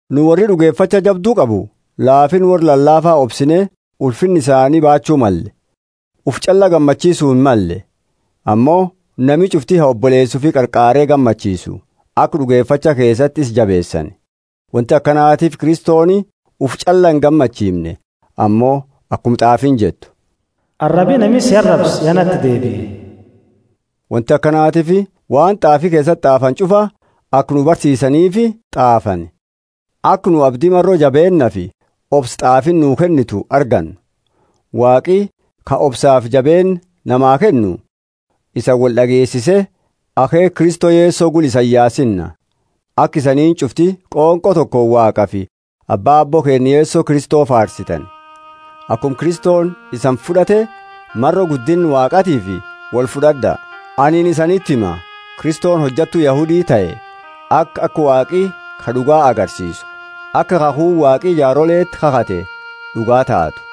Nu worri d'ugefacha jabdu qabu laafinna worra lalaafa obsine ulfinna isaanii baachu malle. Ufi ch'alla gammachiisu himmalle. Ammo nami ch'ufti ha oboleesa ufi qarqaare gammachiisu, aka d'ugefacha keesati isa jabeesani. Wonti akanatiifi Kristoni ufi ch'alla ingammachiimne; ammo akuma t'aafiini jettu, Arabi nami si arabse ya nati deebie. Wonti akanatiifi waan t'aafi keesati t'aafani ch'ufa aka nu barsiisaniifi t'aafani, aka nu abdi maro jabeennaafi obsa t'aafiini nuu kennitu argannu. Waaqi, ka obsafi jabeenna namaa kennu, isani wold'ageesise akheekha Kristo Yeso gula isani yaasina, aka isaniini ch'ufti qonqo tokooni Waaqafi Abba Aabbo keenna Yeso Kristo faarsitani. Akuma Kristoni isani fud'ate, maro guddinna Waaqaatiifi wolfud'ad'a. Anini isaniti hima, Kristoni hojattu Yahudi tahe, aka, aka Waaqi ka d'uga, agarsiisu; aka khakhuuni Waaqi jaaroleti kakhate d'ugaa taatu,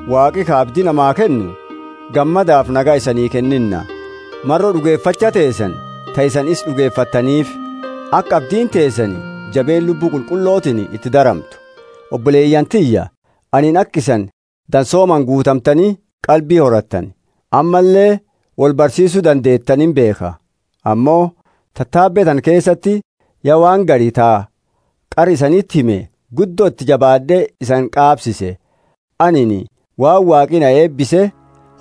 Waaqi, ka abdi namaa kennu, gammadafi nagaya isanii kennina maro d'ugefacha teesani ta isani isa d'ugefattaniifi, aka abdiini teesani jabeenna Lubbu Qulqullotiini iti daramtu. Oboleyaani tiyya, anini aka isani dansoomaani guutamtani qalbi horattani, ammalle wolbarsiisu dandeetani imbeekha. Ammo tatabe tana keesati ya waan gari ta qara isaniti hime guddo iti jabaad'e isani qaabsiise. Anini waan Waaqi na eebise,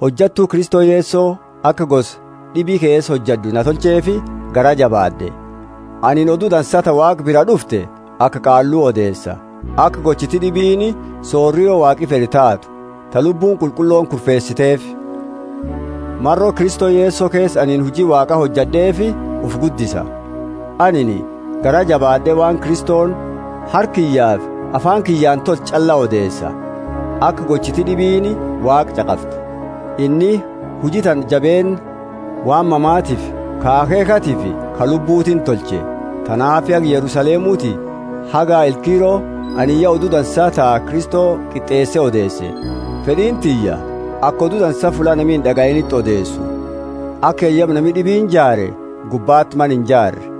hojattu Kristo Yeso aka gosa d'ibi keesa hojad'u na tolcheefi garaa jabaad'e. Anini Odu Dansa ta Waaqa biraa d'ufte aka qaallu odeesa, aka gochiti d'ibiini sorio Waaqi fed'u taatu, ta Lubbuuni Qulqullooni kurfeesiteefi. Maro Kristo Yeso keesa anini huji Waaqa hojad'eefi ufi guddisa. Anini garaa jabaad'eti waan Kristoni harka kiyyafi afaani kiyyaani tolche ch'alla odeesa, aka gochiti d'ibiini Waaqa ch'aqaftu. Inni huji tana jabeenna waan mamatiifi ka akheekhatifi ka lubbutiini tolche. Tanaafi haga Yerusalemuti haga Ilkiro anini ya Odu Dansa ta Kristo qit'eese odeese. Fed'iini tiyya aka Odu Dansa fulla nami ind'agayiiniti odeesu, aka yayaba nami d'ibiini jaare gubbati mana inijaarre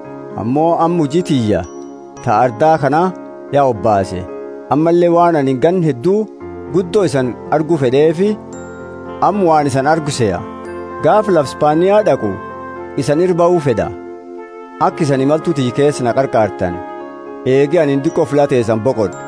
Ammo amma huji tiyya ta arda kana ya hobaase, ammalle waan anini ganna heddu guddo isani argu fed'eefi, amma waan isani argu seha. Gaafa lafa Spania d'aqu isani ira bahu fed'a, aka isani imaltu tiyya keesati na qarqaartani, eegi anini diqo fulla teesani boqad'e.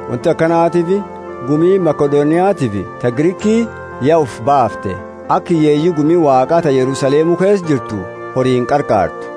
Wonti akanatiifi gumiini Makedoniatiifi ta Griki ya ufi baafte, aka hiyyeeyi gumi Waaqa ta Yerusalemu keesa jirtu horiini qarqaartu.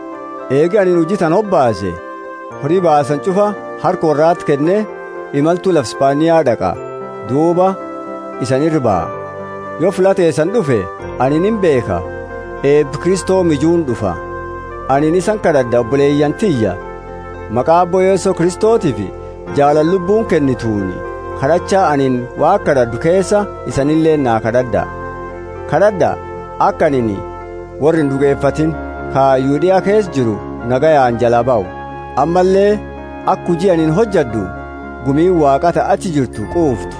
Eegi anini huji tana hobaase, hori baasani ch'ufa harka worrati kenne, imaltu lafa Spania d'aqa, duuba isani ira baha. Yo fulla teesani d'ufe, anini imbeekha, eeba Kristo mijuuni d'ufa. Anini isani kad'ad'a oboleyaani tiyya, maqa Aabbo Yeso Kristotiifi jaalala lubbuuni kennituni: kad'acha anini Waaqa kad'ad'u keesa isanileeni naa kad'ad'a. Kad'ad'a, aka anini worra ind'ugefatiini ka Yudea keesa jiru nagayaani jalaa bahu, ammalle aka huji anini hojad'u gumiini Waaqa ta achi jirtu quuftu.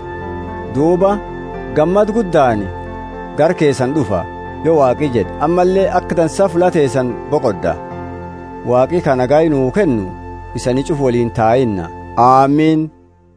Duuba, gammada guddaani gara keesani d'ufa, yo Waaqi jed'e, ammalle aka dansa fulla teesani boqod'a. Waaqi, ka nagaya nuu kennu, isani ch'ufa woliini tahinna. Amini.